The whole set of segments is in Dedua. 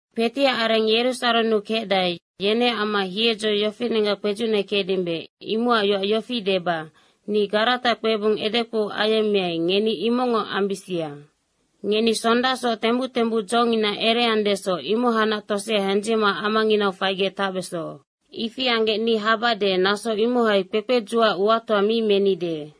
Kpetiac areng Yerusarennu kecdae, yeneac amma hiedzo yofinenggac kpedzucnekecdimbe, imocac yoac yofi deba, ni Garata kpebung edekpou ayemmeai, ngeni imocngoc ambisia. Ngeni sondasoc tembuc tembuc dzongina ereandesoc, imohacnac tosea hendzicma amanginau faigec tacbeso. Ifi anggec ni habade, naso imohai kpekpedzucac uatoa mi menide.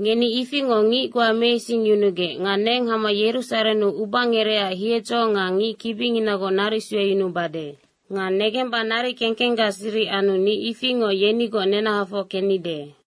Ngeni ifingoc ngic goa meisingyunugec nga neng hama Yerusarennu ubangerecac hiedzo nga ngic kibinginagoc naric sueyunubade. Nga negemba naric kekenggac siric anu ni ifingoc yenigoc nenahafoc kennide.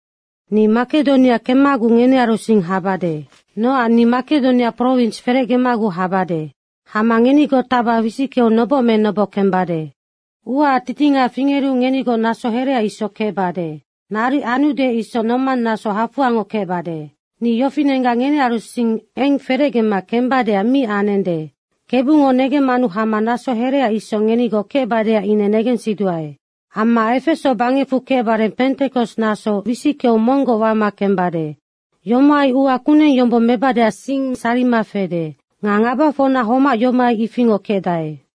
Ni Makedonia kemmaguc ngenearu sing habade. Nocac ni Makedonia prowins ferecgemaguc habade. Hama ngenigoc tacba wisickeu noboc me noboc kembade. Uaac titinga fingeru ngenigoc naso herea isoc kecbade. Naric anude isoc nomang naso hafoangoc kecbade. Ni yofinenggac ngenearusing eng ferecgema kembadeac mi anende. Kebungo negemmanu hama naso herea isoc ngenigoc kecbadeac ine negensiduae. Amma Efeso bangecfu kecbare Pentekos naso wisickeu monggoc wama kembade. Yomohai ua kuneng yombong mebadeac sing sarima fede. Nga ngabafocna homac yomohai ifingoc kecdae.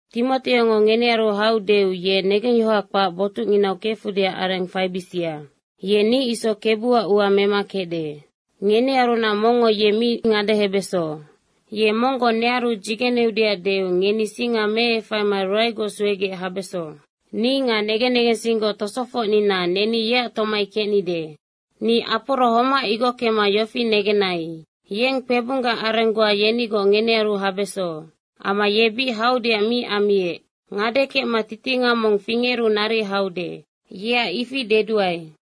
Timoteongo ngenearu haudeu ye negengyohoha kpac botucnginau kefudeac areng faibisia. Ye ni isoc Kebuac ua mema kecde. Ngenearunac mongngo ye mi ngadehebeso. Ye monggoc nearu dzigeneudeac deu ngeni singa meefaima ruaegoc suegec habeso. Ni nga negen negensinggoc tosofocnina neni yeac tomai kecnide. Ni Aporo homac igockema yofi negenai. Yeng kpebunggac areng goa yenigoc ngenearu habeso. Amma ye bic haudeac mi ammiec. Ngade kecma titinga mong fingeru naric haude. Yeac ifi deduae.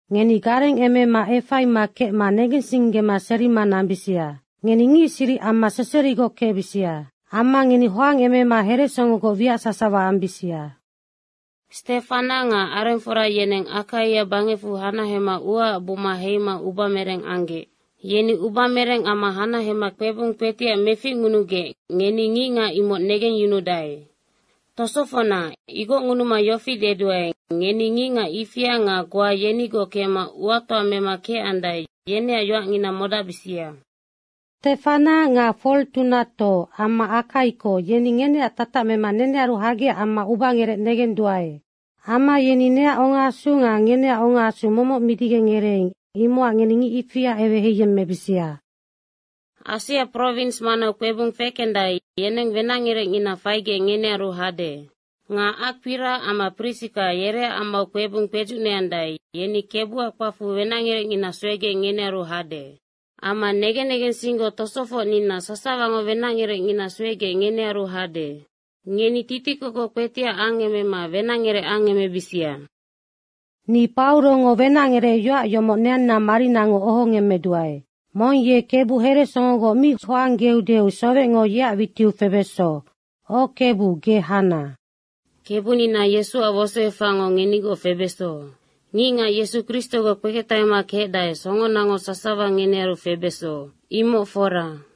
Ngeni garengemema efaima kecma negensinggema serima nambisia. Ngeni ngic siric amma seserigoc kecbisia. Amma ngeni hoangemema heresongogoc wiac sasawa ambisia. Stefana nga arengfora yeneng Akaia bangecfu hanahema uaac buma heima ubamereng anggec. Yeni ubamereng amma hanahema kpebung kpetiac meficngunugec, ngeni ngicngac imoc negengyunudae. Tosofocna, igocngunuma yofi deduae, ngeni ngicngac ifia nga goa yenigoc kecma uatoa mema kecandae, yeneac yoacngina modacbisia. Stefana nga Fortunato amma Akaiko, yeni ngeneac tatac mema nearu hagecac amma ubangerec negenduae. Amma yeni neac ongaasu nga ngeneac ongaasu momoc midigec ngereeing, imocac ngeni ngic ifia eweheiyemmebisia. Asia prowins manau kpebung fekendae, yeneng wenacngerecngina faigec ngenearu hade. Nga Akpira amma Prisika, yereac amau kpebung kpedzucneandae, yeni Kebuac kpacfu wenacngerecngina suegec ngenearu hade. Amma negen negensinggoc tosofocnina sasawango wenacngerecngina suegec ngenearu hade. Ngeni titikokoc kpetiac angemema wenacngerec angemebisia. Ni Paurongo wenacngerecyoac yomoc neanna marinango ohongemmeduae. Mong ye Kebu heresongogoc mi hoanggeudeu sowecngo yeac witiu febeso. O Kebu, ge hana. Kebunina Yesuac wosoefacngo ngenigoc febeso. Ngicngac Yesu Kristogoc kpeketahema kecdae, songonango sasawa ngenearu febeso. Imoc fora.